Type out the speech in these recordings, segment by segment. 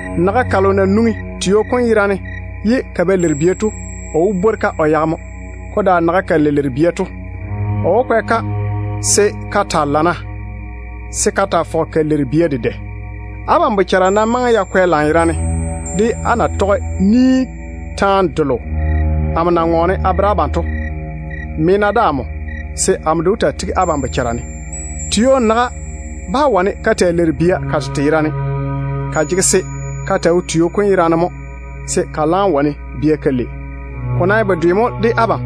Naga kalo na nwoŋi tio kom yera ne ye ka ba leiri bia to, o wó gwo-ka o yage mo. Ko daare naga kalo na leiri bia to, o wó fɔge o kwɛ-ka mo se ka taa leiri bia dedɛ. Abam bochara nam maŋe ya kwɛ lanyerane, á na sɛ taane delo amo na ŋɔɔne a bere abam to ŋwaane. Me-na de amo, se amo de wó taa tigi abam bochara ne. Tio naga bá wane ka taa leiri bia ka tete yerane. Ka jege se ka taa wo tio kom yera ne mo se ka laam wane bia ka lei. Ko nam ye bedwe mo de abam.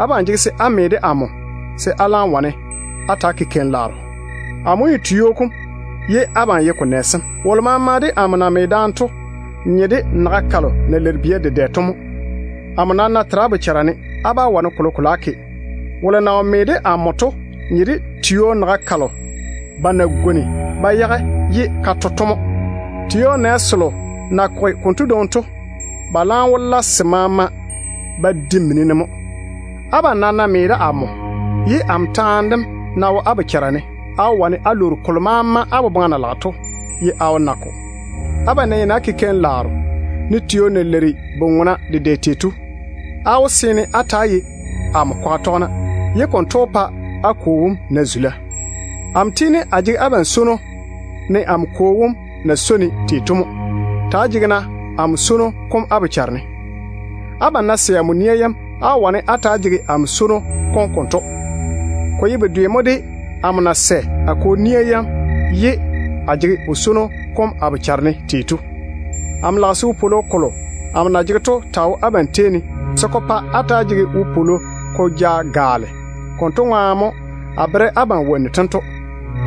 Abam jege se á me de amo, se á laam wane á ta‑á ke keim-laaro. Amo mo ye Vini tio kom, ye abam ye ko nɛ sem. Wolo maama de amo na me daane to nye de naga kalo na leiri bia dedɛ to mo. Amo nam ná tera á bochara ne, á bá wane kolokolo á ke. Wolo na wo me de amo to nye de tio naga kalo ba na gwoni ba yage ye ka ko to mo. Tio nɛ selo na koge konto dwoŋi to, ba laam wó pɛ se maama ba de mini ne mo ye se di. Abam nam ná me de amo, ye amo taane dem ná wo á bochara ne, á wó wane á lwoori kolo maama á boboŋa na tɔge to, ye á wó na-ko. Abam ná yeini á ke keim-laaro, ne tio na leiri bu-ŋona dedɛ tei to, á wó seene á ta‑á ye amo kwaga tɔgena, ye konto wó pa a Kwo wom na zula. Amo tiini a jege abam swono ne amo Kwo wom de na swoi-ne tei to mo. Ta‑á jege-na amo swono kom á bochara ne. Abam ná toŋe á tɔge amo nia yam, á wó wane á ta‑á jege amo swono kom konto. Ko ye bedwe mo de amo na sɛ a Kwo nia yam ye a jege o swono kom a bochare ne tei to. Amo lage se ywoni delo amo na jege to taa wo abam tei ne, se ko pa á wopwolo kom tiini ko gaale. Konto ŋwaane mo a tage wonnu tento taane a bere abam.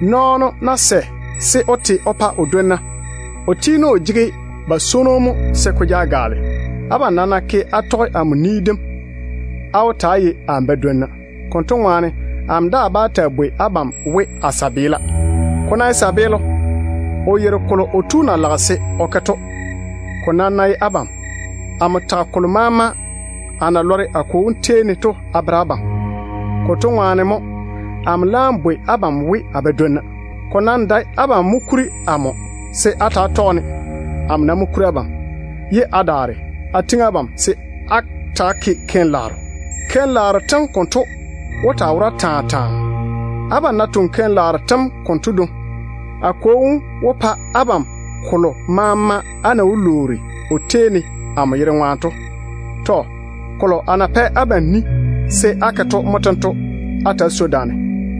Nɔɔno ná sɛ se o te o dwonna ŋwaane, kotu tiini o jege ba swono mo se ko ja gaale. Abam nam ná ke á tɔge amo ni dem, á wó ta‑á ye a badwonna mo. Amo daa bá taa bwoi abam we, amo tontoŋena. Ko ná ye tontoŋeno, o yeiri kolo o tu na lage se o ke to. Ko nam ná ye abam, amo tage kolo maama a na lɔre a Kwo wom tei ne to a bere abam. Konto ŋwaane mo amo laam bwoi abam we a badwonna. Ko nam dae abam mo kuri amo se á ta‑á tɔge-ne. Amo nam mo kuri abam, ye a daare a tiŋi abam se á ta‑á ke keim-laaro. Keim-laaro tem konto wó taa wora taa taa. Abam ná toŋe keim-laaro tem konto dwoŋi, a Kwo wom wó pa abam kolo maama á na wó lwoori o tei ne amo yere ŋwaane to. Kolo a na pɛ abam ni se á ke to mo tento: Á ta‑á swoi daane.”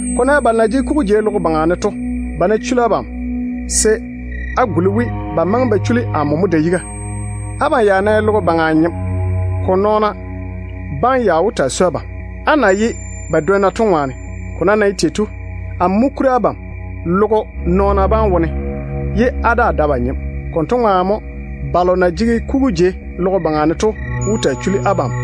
“Ko ná ye balo na jege kugu jei logo baŋa ne to, ba ná chuli abam, se á ta‑á yei we ba maŋe ba da yiga ba chuli amo mo. Abam ya ná ye logo baŋa nyem, ko nɔɔna bam ya wó taa swoi abam, á na ye ba dwonna to ŋwaane. Ko nam na ye tei to, amo mo kuri abam logo baŋa nɔɔna bam wone, ye á daa dae ba nyem. Konto ŋwaane mo balo na jege kugu jei logo baŋa ne to wó taa chuli abam.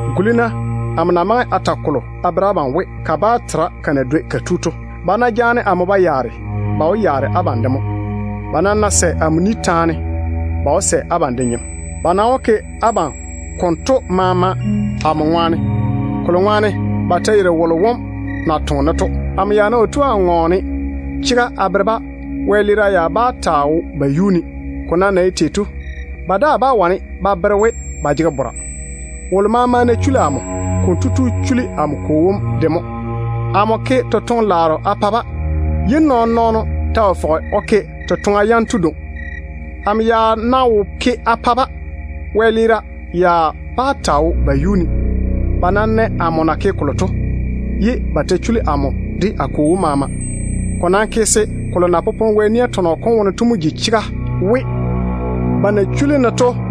Guli-na amo na maŋe a ta kolo a bere abam to we: kabaa tera ka na dwoi ka yuu tu to. Ba na jaane amo ba yaare to, ba ta wó yaare abam de mo. Ba nam ná sɛ amo ni taane, ba wó sɛ abam de ni taane mo. Ba nam wó ke abam konto maama amo ŋwaane, kolo ŋwaane ba yeiri wolo wom na toŋe-ne to. Amo ya ná wo tu a ŋɔɔne chega a bere-ba, wɛleera ya bá taa wo ba yuu ne. Ko nam na ye tei to, ba daa bá wane ba bere we ba jege bora. Wolo maama ná chuli amo, konto tu chuli amo Kwo wom de mo. Amo ke totoŋ-laaro a bere-ba, ye nɔɔn-nɔɔno ta wo fɔge o ke totoŋa yanto dwoŋi. Amo ya ná wo ke a bere-ba, wɛleera ya bá taa wo ba yuu ne. Ba nam nɛ amo na ke kolo to, ye ba ta chuli amo de a Kwo wom maama. Ko nam ke se kolo na popone Wɛ nia tɔnɔ kom wone to mo ji chega we, ‘Ba chuli-ne kafɛ ŋwaane.’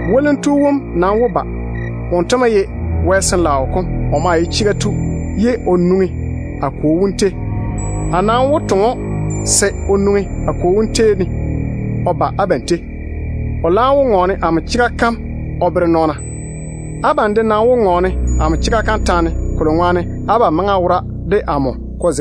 Zeinnu wom nam wó ba. Wonto mo ye Wɛ Sin-laao kom. O maa ye chega tu, ye o nwoŋi a Kwo wom tei. A nam wó toŋe‑o se o nwoŋi a Kwo wom tei o ba abam tei. O laam wó ŋɔɔne amo chega kam mo o bere nɔɔna. Abam de nam wó ŋɔɔne a chega kam taane, kolo ŋwaane ko zege boboa ne mo, abam maŋe á wora de amo.”